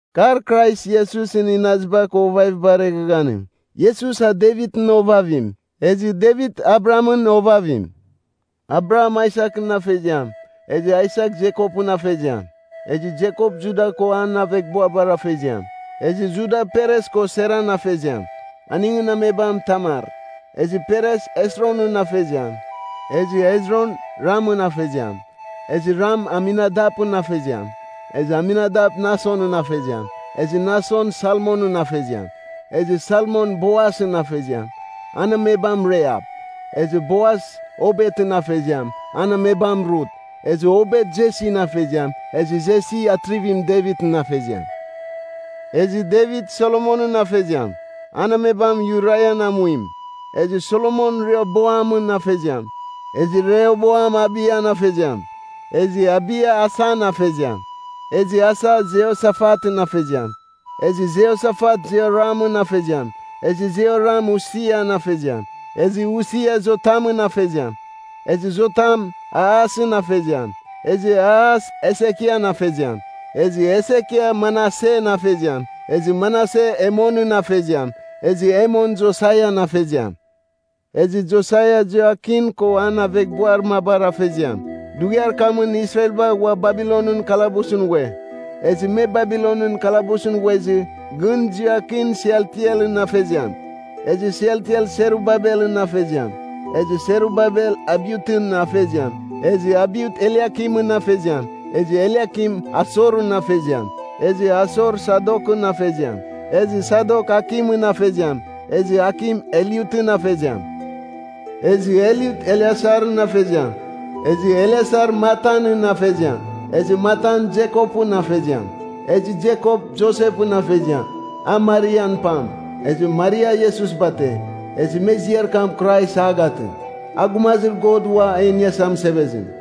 Kar Krais Iesusɨn inaziba ko ovavibar eghaghanim. Iesus a Devitɨn ovavim. Ezɨ Devit Abrahamɨn ovavim. Abraham Aisakɨn afeziam. Ezɨ Aisak, Jekopɨn afeziam. Ezɨ Jekop Juda ko an aveghbuabar afeziam. Ezɨ Juda, Peres ko Seran afeziam. Aningɨn amebam Tamar. Ezɨ Peres Hesronɨn afeziam, Ezɨ Hezron, Ramɨn afeziam. Ezɨ Ram Aminadapɨn afeziam, Ezɨ Aminadap Nasonɨn afeziam; Ezɨ Nason Salmonɨn afeziam. Ezɨ Salmon Boasɨn afeziam. An amebam Rahap. Ezɨ Boas Obetɨn afeziam, an amebam Rut. Ezɨ Obet Jesin afeziam, Ezɨ Jesi Atrivim Devitɨn afeziam. Ezɨ Devit Solomonɨn afeziam, an amebam Urian amuim. Ezɨ Solomon Rehoboamɨn afeziam. Ezɨ Rehoboam Abiyan afeziam, Ezɨ Abiya Asan afeziam. Ezɨ Asa Jehosafatɨn afeziam. Ezɨ Jehosafat Jehoramɨn afeziam. Ezɨ Jehoram Usian afeziam. Ezɨ Usia Jotamɨn afeziam. Ezɨ Jotam Ahasɨn afeziam. Ezɨ Ahas Hesekian afeziam. Ezɨ Hesekia Manasen afeziam. Ezɨ Manase Emonɨn afeziam. Ezɨ Emon Josaian afeziam. Ezɨ Josaia Jehoiakin ko an aveghbuar mabar afeziam. Dughiar kamɨn Israelba ghua Babilonɨn kalabusɨn ghue. Ezɨ me Babilonɨn kalabusɨn ghuezɨ, gɨn Jehoiakin Sealtielɨn afeziam. Ezɨ Sealtiel Serubabelɨn afeziam. Ezɨ Serubabel Abiutɨn afeziam. Ezɨ Abiut Eliakimɨn afeziam. Ezɨ Eliakim Asorɨn afeziam. Ezɨ Asor Sadokɨn afeziam. Ezɨ Sadok Akimɨn afeziam. Ezɨ Akim Eliutɨn afeziam. Ezɨ Eliut Eleasarɨn afeziam. Ezɨ Eleasar Matanɨn afeziam. Ezɨ Matan Jekopɨn afeziam. Ezɨ Jekop Josepɨn afeziam, a Marian pam. Ezɨ Maria Iesus bate, ezɨ me ziar kam Krais a gatɨ. A Gumazir God Uam E Iniasa Mɨsevezim.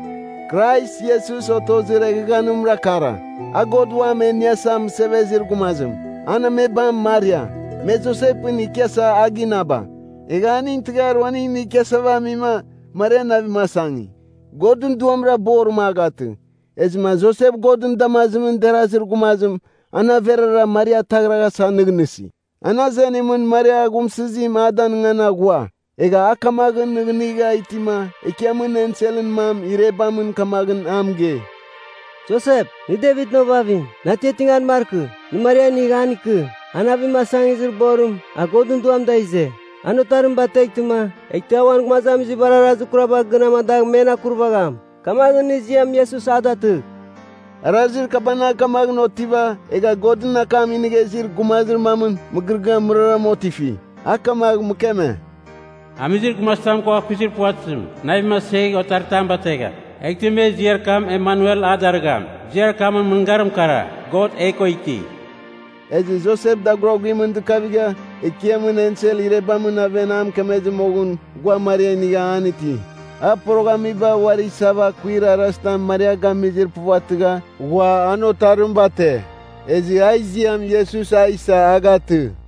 Krais Iesus otozir eghaghanimra kara, a God Uam e Iniasa Mɨsevezir Gumazim. An amebam Maria, me Josepɨn ikiasa a ginaba. Egha aning tɨghar uaning inigh ikiasava amima, Maria navim asangi. Godɨn Duamra borim a gatɨ. Ezɨma Josep Godɨn damazim derazir gumazim an averara Maria ataghraghasa nɨghnɨsi. An azenimɨn Maria aghumsɨzim a danɨngan aghua. Egha a kamaghɨn nɨghnɨgha itima Ekiamɨn enselɨn mam irebamɨn kamaghɨn a mɨgei, “Josep, nɨ Devitɨn ovavim, nɨ atiatingan markɨ. Nɨ Maria inigh an ikɨ. A navim asangizir borim, a Godɨn Duam da ize. An otarim bateghtɨma, eghtɨ a uan gumazamizibar arazir kuraba gɨn amadagh men akurvagham. Kamaghɨn nɨ ziam Iesus a datɨgh.” Arazir kabanagh kamaghɨn otiva, egha Godɨn akam inigha izir gumazir mamɨn mɨgɨrɨgɨamɨn mɨraram otifi. A kamagh mɨkeme, “Amizir gumazitam ko akuizir puvatɨzim navim asegh, otaritam bategham. Eghtɨ me ziar kam Emanuel a darɨgham, ziar kamɨn mɨngarim kara, ‘God e ko iti.’” Ezɨ Josep daguraguimɨn dɨkavigha, Ekiamɨn ensel irebamɨn aven a mɨkemezɨ moghɨn, ghua Maria inigha an iti. A poroghamiba uari isava akuir arazitam Maria gamizir puvatɨgha, ghua an otarim bate. Ezɨ a ziam Iesus a isa a gatɨ.